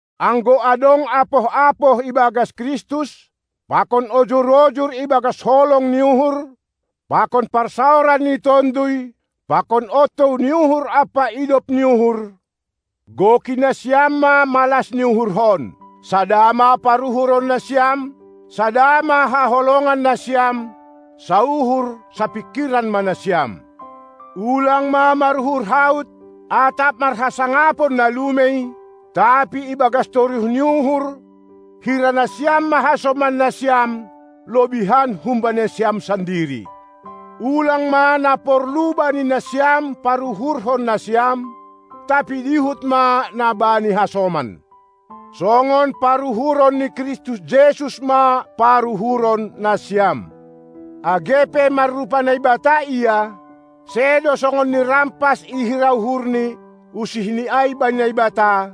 Anggo adong apoh-apoh ibagas Kristus, pakon ojur-ojur ibagas holong ni uhur, pakon parsaoran ni Tonduy, pakon ontou ni uhur ampa idop ni uhur, goki nasiam ma malas ni uhurhon: Sada ma paruhuron nasiam, sada ma haholongon nasiam, sauhur, sapingkiran ma nasiam! Ulang ma maruhur haut atap marhasangapon na lumei, tapi ibagas toruh ni uhur hira nasiam ma hasoman nasiam lobihan humbani nasiam sandiri! Ulang ma na porlu bani nasiam paruhurhon nasiam, tapi dihut ma na bani hasoman! Songon paruhuron ni Kristus Jesus ma paruhuron nasiam! Age pe marrupa Naibata Ia, sedo songon nirampas ihira uhurNi usihNi ai bani Naibata,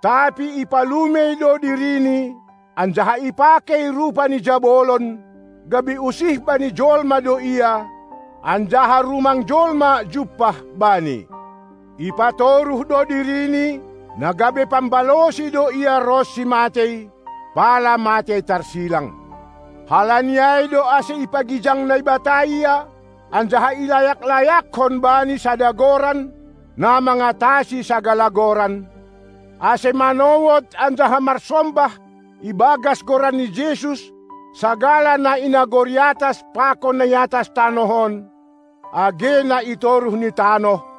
tapi ipalumei do diriNi anjaha ipakei rupa ni jabolon, gabe usih bani jolma do Ia, anjaha rumang jolma jumpah Bani. Ipatoruh do diriNi, na gabe pambalosi do Ia ronsi matei, pala matei tarsilang. Halani ai do ase ipagijang Naibata Ia, anjaha ilayak-layakkon Bani sada goran, na mangatasi sagala goran, ase manowod anjaha marsombah ibagas goran ni Jesus sagala na i nagori atas pakon na i atas tanoh on, age na i toruh ni tanoh,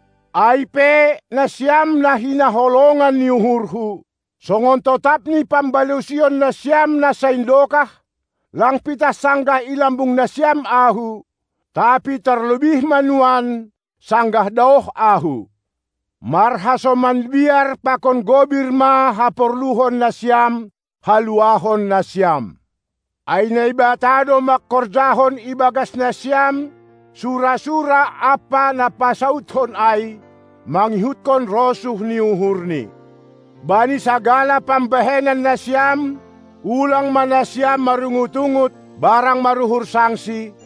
Ai pe nasiam na hinaholongan ni uhurhu, songon totap ni pambalosion nasiam na saindokah, lang pitah sanggah i lambung nasiam ahu, tapi tarlobih ma nuan, sanggah daoh ahu: Marhasoman biar pakon gobir ma haporluhon nasiam haluahon nasiam; ai Naibata do mangkorjahon ibagas nasiam sura-sura ampa na pasaudhon ai, mangihutkon rosuh ni uhurNi. Bani sagala pambahen nasiam, ulang ma nasiam marungut-ungut barang maruhur sangsi,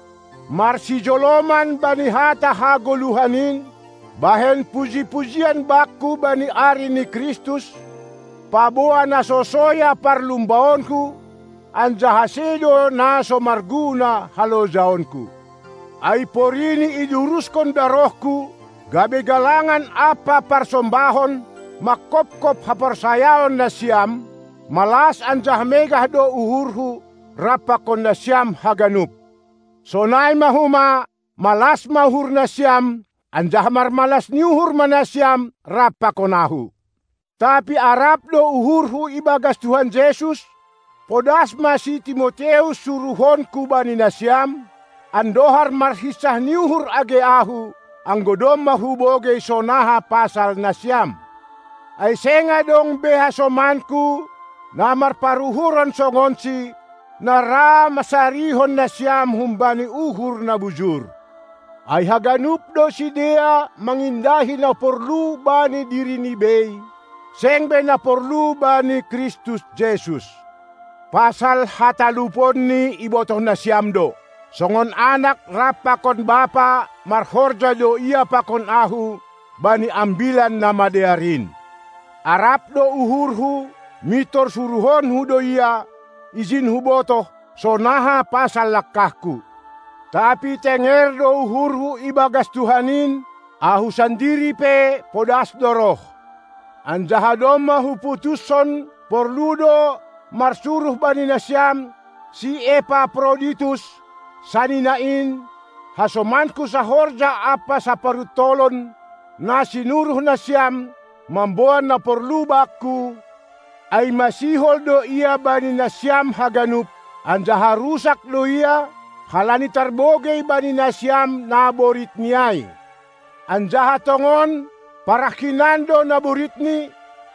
marsijoloman bani hata hagoluhan in, bahen puji-pujian bakku bani ari ni Kristus, paboa na so soya parlumbaonku anjaha sedo na so marguna halojaonku. Ai porini iduruskon darohku gabe galangan ampa parsombahon, mangkopkop haporsayaon nasiam, malas anjaha megah do uhurhu rap pakon nasiam haganup. Sonai ma homa malas ma uhur nasiam, anjaha marmalas ni uhur ma nasiam rap pakon ahu. Tapi arap do uhurhu ibagas Tuhan Jesus, podas ma si Timoteus suruhonku bani nasiam, andohar marhinsah ni uhur age ahu, anggo domma hubogei sonaha pasal nasiam. Ai seng adong be hasomanku na marparuhuron songonsi, na ra mansarihon nasiam humbani uhur na bujur. Ai haganup do sidea mangindahi na porlu bani dirini bei, seng be na porlu bani Kristus Jesus. Pasal hataluponni ibotoh nasiam do: Songon anak rap pakon bapa marhorja do ia pakon ahu bani Ambilan Namadear in. Arap do uhurhu mintor suruhonku do ia, ijin hubotoh, sonaha pasal langkahku. Tapi tenger do uhurhu ibagas Tuhan in, ahu sandiri pe podas do roh. Anjaha domma huputuskon porlu do marsuruh bani nasiam si Epaproditus, sanina in, hasomanku sahorja ampa saparuntolon, na sinuruh nasiam, mamboan na porlu bakku, ai masihol do ia bani nasiam haganup, anjaha rusak do ia, halani tarbogei bani nasiam naboritni ai. Anjaha tongon parah hinan do naboritni,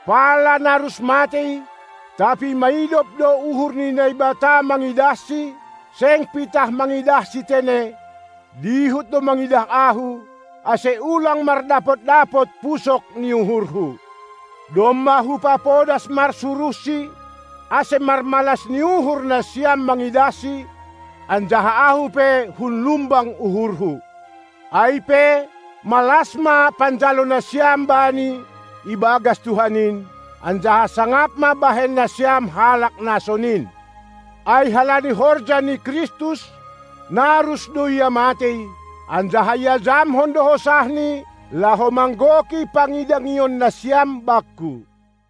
pala narus matei; tapi maidop do uhur ni Naibata mangidahsi, seng pitah mangidahsi tene, dihut do mangidah ahu, ase ulang mardapot-dapot pusok ni uhurhu. Domma hupapodas marsuruhsi, ase marmalas ni uhur nasiam mangidahsi, anjaha ahu pe hunlumbang uhurhu. Ai pe, malas ma panjalo nasiam bani ibagas Tuhan in, anjaha sangap ma bahen nasiam halak na sonin. Ai halani horja ni Kristus narus do ia matei, anjaha iajamkon do hosahni laho manggoki pangidangion nasiam bakku.